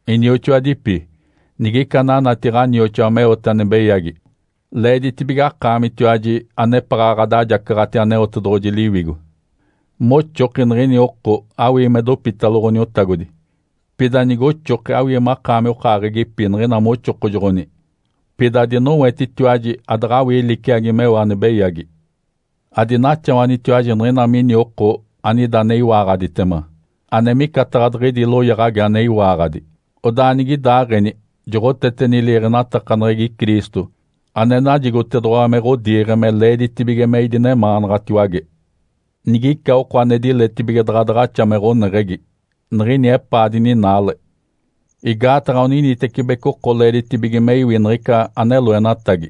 Inioxoadipi, nigica ananati ɡ̶anioxoa meote ane beyagi, leeditibige akaamitiwaji, anepaɡ̶a ɡ̶adajacaɡ̶ati Aneotedoɡ̶oji Liwigo, moxoki niɡ̶ini oko awii me dopitalo Ǥoniotagodi. Pida nigoxoki awii makaami okaaɡ̶egipi niɡ̶ina me oxokojoɡ̶oni, pida adinowetitiwaji adaɡ̶awii liciagi meo ane beyagi. Adinaxawanitiwaji nigina mini oko anida ane iwaaɡ̶aditema, ane micataɡ̶a diɡ̶idi loyaɡ̶agi ane iwaaɡ̶adi. Odaa nigidaaɡ̶eni joɡ̶oteteni liiɡ̶enatakaneɡ̶egi Cristo ane najigotedoɡ̶owa me ɡ̶odiiɡ̶e me leeditibige me idinemaanaɡ̶atiwage. Nigica oko ane diletibige daɡ̶a daɡ̶axa me ɡ̶oneɡ̶egi, niɡ̶ini epaa dininaale. Igaataɡ̶a oninitecibeci oko leeditibige me iwi niɡ̶ica ane loenatagi.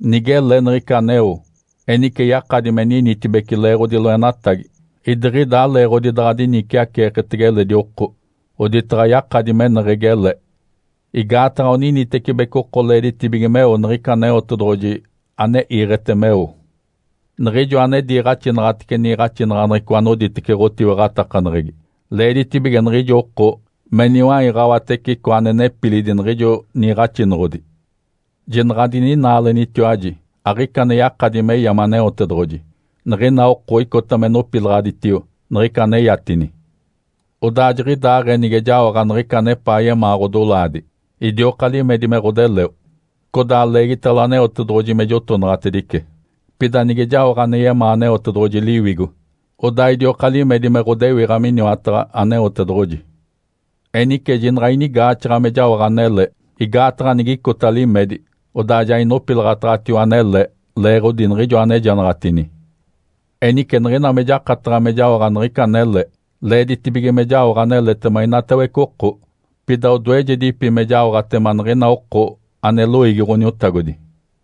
Nigele niɡ̶ica aneo, enice yakadi me ninitibece leeɡ̶odi loenatagi, idiɡ̶ida aleeɡ̶odi daɡ̶a diniciaceeketege eledi oko, oditaɡ̶a yakadi meneɡ̶egi ele. Igaataɡ̶a oninitecibeci oko leeditibige meo niɡ̶ica Aneotedoɡ̶oji ane iiɡ̶ete meo. Niɡ̶ijo ane diniiɡ̶axitece niiɡ̶axinaɡ̶aneɡ̶eco anoditece ɡ̶otiwaɡ̶atakaneɡ̶egi, leeditibige niɡ̶ijo oko me niwaiɡ̶awatece icoa ane nepilidi niɡ̶ijo niiɡ̶axinoɡ̶odi. Jinaɡ̶a adininaalenitiwaji! Aɡ̶ica ane yakadi me yame Aneotedoɡ̶oji. Niɡ̶ina oko icota me nopilaɡ̶aditio niɡ̶ica aneyatini. Odaa jiɡ̶idaaɡ̶ee nige jaoɡ̶a niɡ̶ica anepaa yemaa ɡ̶odolaadi, idioka limedi me ɡ̶odeleo, codaa leegitalo Aneotedoɡ̶oji me jotonaɡ̶atedice. Pida nige jaoɡ̶a ane yemaa Aneotedoɡ̶oji Liwigo, odaa idioka limedi me ɡ̶odewiɡ̶a miniwataɡ̶a Aneotedoɡ̶oji. Enice jinaɡ̶a inigaaxaɡ̶a me jaoɡ̶a anele. Igaataɡ̶a nigicota limedi, odaa ja inopilaɡ̶ataɡ̶atio anele leeɡ̶odi niɡ̶ijo anejanaɡ̶atini. Enice niɡ̶ina me jakataɡ̶a me jaoɡ̶a niɡ̶ica anele, leeditibige me jaoɡ̶a aneletema inatawece oko, pida odoejedipi me jaoɡ̶atema niɡ̶ina oko ane loiigi Ǥoniotagodi.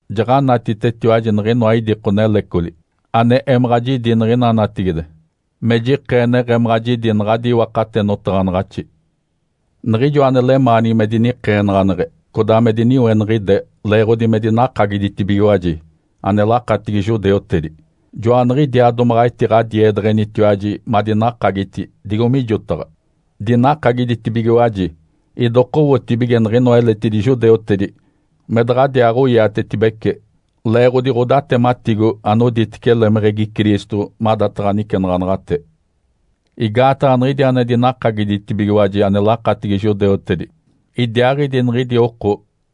Jaɡ̶anatitetiwaji niɡ̶inoa idiko nelecoli ane emaɡ̶a jidi niɡ̶ina natigide me jikee neɡ̶emaɡ̶a jidi naɡ̶adi iwakate notaɡ̶anaɡ̶axi. Niɡ̶ijo ane lemaanigi me dinikeenaɡ̶aneɡ̶e codaa me diniweniɡ̶ide leeɡ̶odi me dinakagiditibigiwaji ane lakatigi judeutedi, joaniɡ̶idiaa domaɡ̶a etiɡ̶adiedeɡ̶enitiwaji madinakagiti digo mijotaɡ̶a. Dinakagiditibigiwaji idokowotibige niɡ̶inoa eletidi judeutedi me daɡ̶adiaaɡ̶oiatetibece leeɡ̶odi ɡ̶odatematigo anoditece lemeɡ̶egi Cristo madataɡ̶a nicenaɡ̶anaɡ̶ate. Igaataɡ̶a niɡ̶idi ane dinakagiditibigiwaji ane lakatigi judeutedi, idiaaɡ̶idi niɡ̶idi oko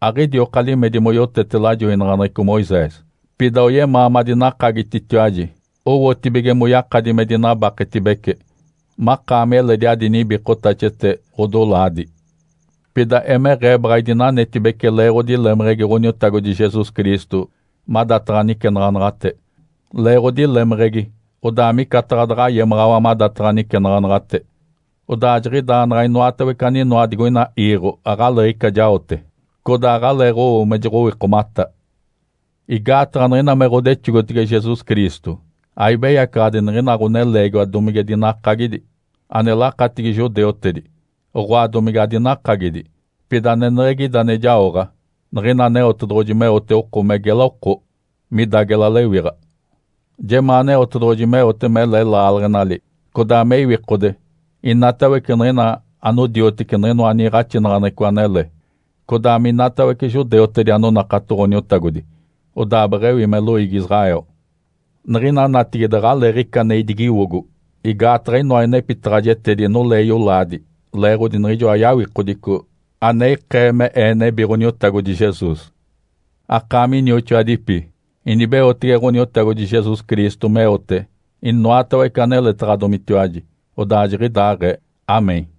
aɡ̶idioka limedi moyotete lajoinaɡ̶aneɡ̶eco Moisés. Pida oyemaa madinakagititiwaji owotibige moyakadi me dinabaketibece makaami eledi adi nibikotaxete ɡ̶adolaadi. Pida emeɡ̶ee baɡ̶a idinanetibece leeɡ̶odi lemeɡ̶egi Ǥoniotagodi Jesus Cristo madataɡ̶a nicenaɡ̶anaɡ̶ate. Leeɡ̶odi lemeɡ̶egi, odaa micataɡ̶a daɡ̶a yemaɡ̶awa madataɡ̶a nicenaɡ̶anaɡ̶ate, odaa jiɡ̶idaa naɡ̶a inoatawece aninoa digoina iiɡ̶o aɡ̶aleeɡ̶ica jaote, codaa aɡ̶aleeɡ̶owo me joɡ̶owikomata. Igaataɡ̶a niɡ̶ina me ɡ̶odexogotege Jesus Cristo, aibeyacaɡ̶adi niɡ̶ina ɡ̶oneleegiwa domige dinakagidi ane lakatigi judeutedi, oɡ̶oa, domige adinakagidi. Pida aneneɡ̶egi ida ane jaoɡ̶a, Niɡ̶ina Aneotedoɡ̶oji meote oko me gela oko, mida gela lewiɡ̶a. Jemaa Aneotedoɡ̶oji meote mele laaleɡ̶enali, codaa me iwikode, inatawece niɡ̶ina anodioteci niɡ̶inoa niiɡ̶axinaɡ̶aneɡ̶eco anele, codaa minatawece judeutedi anonakato Ǥoniotagodi, odaa beɡ̶ewi me loiigi Israel. Niɡ̶ina natigide aɡ̶aleeɡ̶ica ane idigiwogo, igaataɡ̶a inoa inepitaɡ̶ajetedi nolee yolaadi leeɡ̶odi niɡ̶ijoa yawikodico ane ikee me ee nebi Ǥoniotagodi Jesus. Akaami inioxoadipi, inibeotege Ǥoniotagodi Jesus Cristo meote inoatawece aneletaɡ̶adomitiwaji. Odaa jiɡ̶idaaɡ̶ee. (Amém).